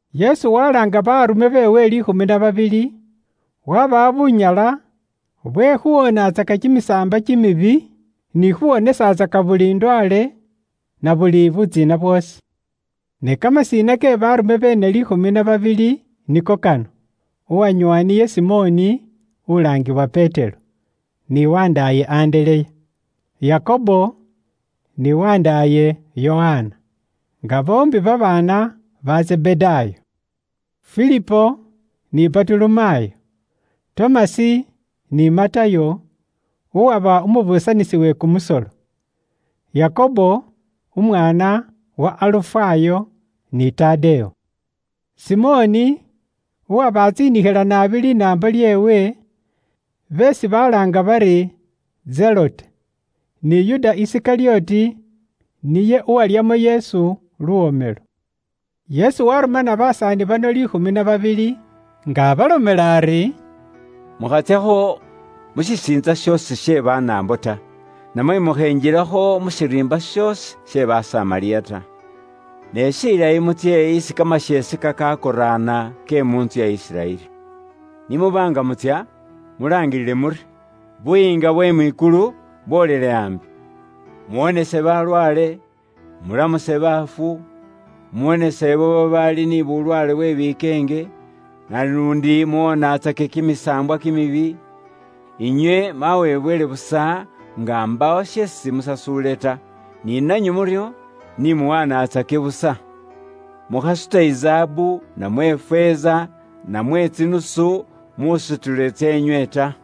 Yesu walaanga baleekelwa beewe liikhumi na babili, wabawa bunyala bwe khuwoonatsaka kimisaambwa kimibi, ni khuwonesatsaka buli ndwaale, na buli butsiina bwoosi. Ni kamasina ke baarume beene liikhumi na babili niko kano: uwanyoowa niye Simoni (ulaangiwa Petero) ni wandaaye Andereya; Yakobo ni wandaaye Yokana, nga boombi babaana ba Zebedaayo; Filipo ni Batolomayo; Tomasi ni Matayo, uwaba umubuusanisi we kumusolo; Yakobo umuwana wa Alufayo; ni Tadewo; Simoni uwaba atsiinikhila naabi linaambo lyeewe (beesi balaanga bari Zelote); ni Yuda Isikalyoti, niye uwalyamo Yesu luwomelo. Yesu waarumana basaani bano liikhumi na babili, nga abalomela ari, “Mukhatsyakho mu shisiintsa shoosi she Banaambo ta, namwe mukhenjilakho mu shiriimba shoosi she Basamariya ta. Ne shilayi mutsye isi kamasheese kakakoraana ke mu ntsu ya Isiraeli. Ni muba nga mutsya, mulaangilile muri, ‘Buyiinga bwe mwikulu bwolele ambi.’ Muwonese balwaale, mulamuse baafu, muwonese ibo babaali ni bulwaale bwe bikeenge, naluundi muwoonatsake kimisaambwa kimibi. Inywe mwawebwele busa nga mbaawo sheesi musasuule ta, ni nanywe muryo ni muwanatsake busa. Mukhasuta izaabu, namwe ifeeza, namwe tsinusu musutilo tseenywe ta.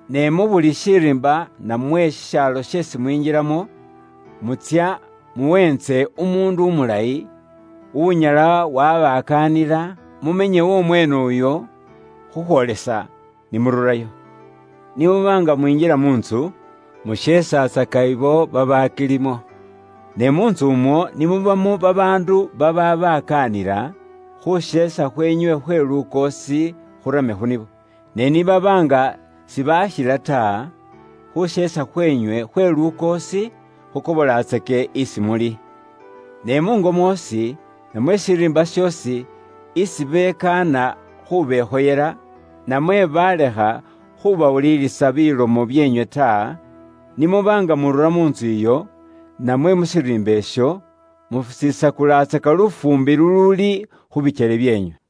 “Ne mu buli shiriimba namwe shishaalo sheesi mwinjilamo, mutsya muweentse umuundu umulayi, unyala wabakaanila, mumenye w'omweene uyo, khukhwoolesa ni mururayo. Ni muba nga mwinjila mu ntsu, musheesatsaka abo babaakilimo. Ne mu ntsu umwo ni mubamo babaandu babaabakaanila, khuusheesa khweenywe khwe lukoosi khurame khu nibo. Ne ni baba nga sibaakhila ta, khuusheesa khweenywe khwe lukoosi khukobolatsake isi muli. Ne muungo mwoosi, namwe shiriimba shoosi isi bekaana khubekhoyela, namwe baalekha khubawulilisa bilomo byeenywe ta, ni muba nga murura mu ntsu iyo, namwe mu shiriimba isho, musisakulatsaka lufuumbi luluuli khu bikyele byeenywe.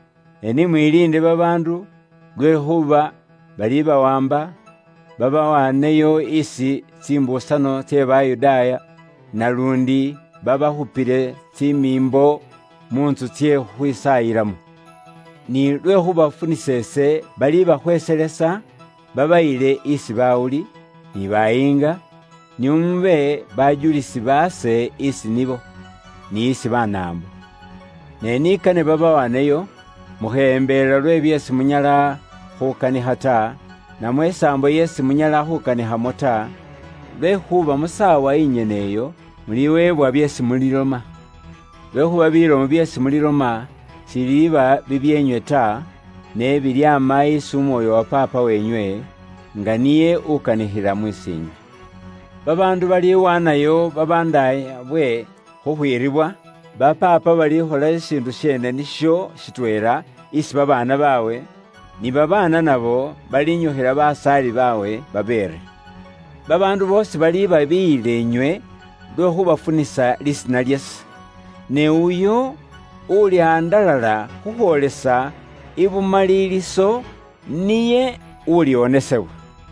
“Ne ni mwiliinde babaandu, lwekhuuba balibawaamba babawaaneyo isi tsimbuusano tse Bayudaaya, naluundi babakhupile tsimiimbo mu ntsu tsye khukhwisaayilamo. Ni lwe khuubafunisa ise, balibakhweeselesa, babayile isi bawuli, ni bayiinga, nio mube bajulisi baase isi nibo, ni isi Banaambo. Ne ni kane babawaaneyo, mukheyembelela lwe byeesi munyala khukanikha ta, namwe isaambo isi munyala khuukanikhamo ta, lwekhuuba mu saawa inyene iyo, muliweebwa byeesi muliloma. Lwekhuuba bilomo byeesi muliloma sibiliiba bibyeenywe ta, ne bilyaama isi Umwoyo wa Paapa weenywe, nga niye ukanikhila mus'iinywe. “Babaandu baliwaanayo babandaayabwe khukhwiribwa, ba paapa balikhola shishiindu sheene nisho shitweela isi babaana baabwe, ni babaana nabo balinyukhila basaali baabwe babeere. Babaandu boosi balibabiiyila inywe, lwe khuubafunisa lisiina lyase. Ne uyo ulihandalala khukhwoolesa ibumaliliso, niye uliwonesebwa.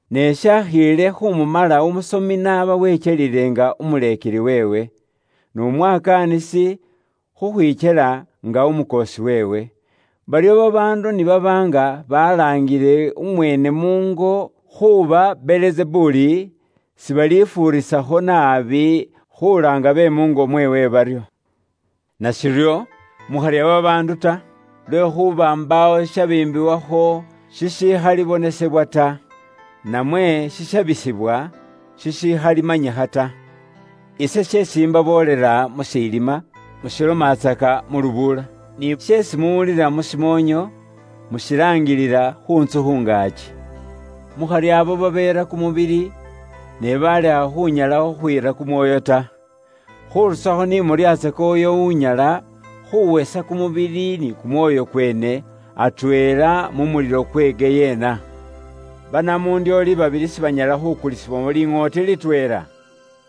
Ne umuleekelwa shiba shimumala, n'aba wekyelile nga umuleekeli weewe, n'umwakaanisi khukhwikyela nga umukoosi weewe. Baryo babaandu ni baba nga balaangile umweene muungo khuuba Belizebuli, sibalifuurisakho naabi khulaanga be muungo mweewe baryo! “Nashiryo, mukharya babaandu ta. Lwekhuuba mbaawo shishabiimbiwakho shishikhalibonesebwa ta, namwe shishabisibwa shishikhalimanyikha ta. Ise sheesi imbaboolela mu shilima, mushilomatsaka mu lubuula; ni sheesi muwulilila mu shimoonyo mushilaangilila khu ntsu khu ngaaki. Mukharya ibo babeera kumubili ne baalekha khunyala khukhwiira kumwoyo ta. Khurusakho ni muryatsake uyo unyala khuwesa kumubili ni kumwoyo kweene atweela mu mulilo kukukhasima ta. Banamundyoole babili sibanyala khukulisibwamo liŋooti litweela?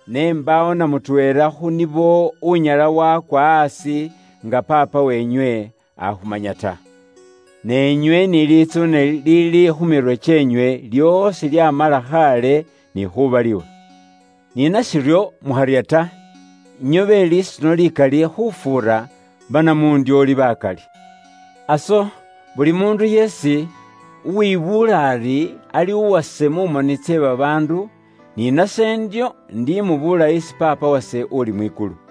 Ne mbaawo na mutweela khu nibo unyala wakwa aasi nga Paapa weenywe akhumanya ta. Ne inywe ni litsuune liliili khu mirwe kyeenywe lyoosi lyamala khaale ni khubaliwa. Ni nashiryo, mukharya ta, inywe be lisuno likali khufuura banamundyoole bakali. “Aso, buli muundu yeesi uwibuula ari ali uwase mu moni tse babaandu, ni nase ndyo indimubuula isi Paapa wase uli mwikulu.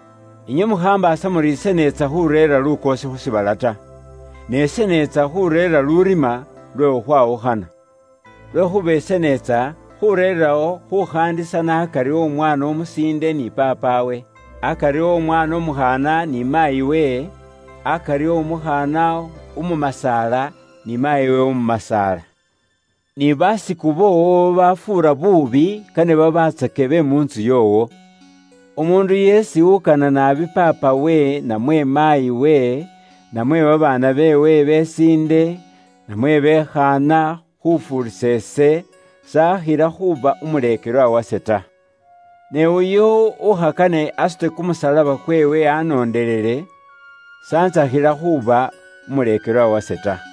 “Inywe mukhambaasa muri ise neetsa khuureera lukoosi khu shiibala ta. Ne ise neetsa khuureera lurima lwe khukhwawukhana. Lwekhuuba ise neetsa khureerawo khukhaandisana akari o mwaana umusiinde ni paapawe; akari o mwaana umukhaana ni maayiwe, akari o mukhaana umumasaala ni maayiwe umumasaala. Ni basiku boowo babafuura buubi kane babatsake be mu ntsu yoowo. “Umuundu yeesi ukana naabi paapawe namwe maayiwe, namwe babaana beewe besiinde, namwe be khaana, khufuurisa ise, s'akhila khuuba umuleekelwa wase ta. Ne uyo ukhakane asute kumusalaba kweewe anoondelele ise, aba s'akhila ni khuuba umuleekelwa wase ta.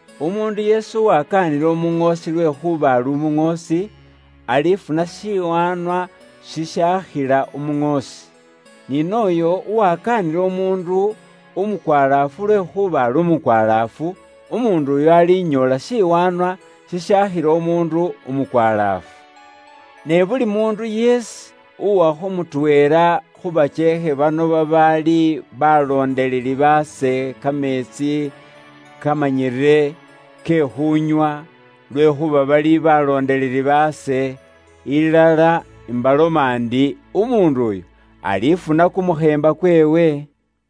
Umuundu yeesi uwakaanila umuŋoosi lwekhuuba ali umuŋoosi, alifuna shiwaanwa shishaakhila umuŋoosi. Ni nooyo uwakaanila umuundu umukwalaafu lwekhuuba ali umukwalaafu, umuundu uyo alinyoola shiwaanwa shishaakhila umuundu umukwalaafu. Ne buli muundu yeesi uwakho mutweela khu bakyeekhe bano kameetsi kamanyire ke khuunywa lwekhuuba bari ali umuleekelwa wase, ilala imbaloma ndi, umuundu uyo alifuna kumukheemba kweewe.”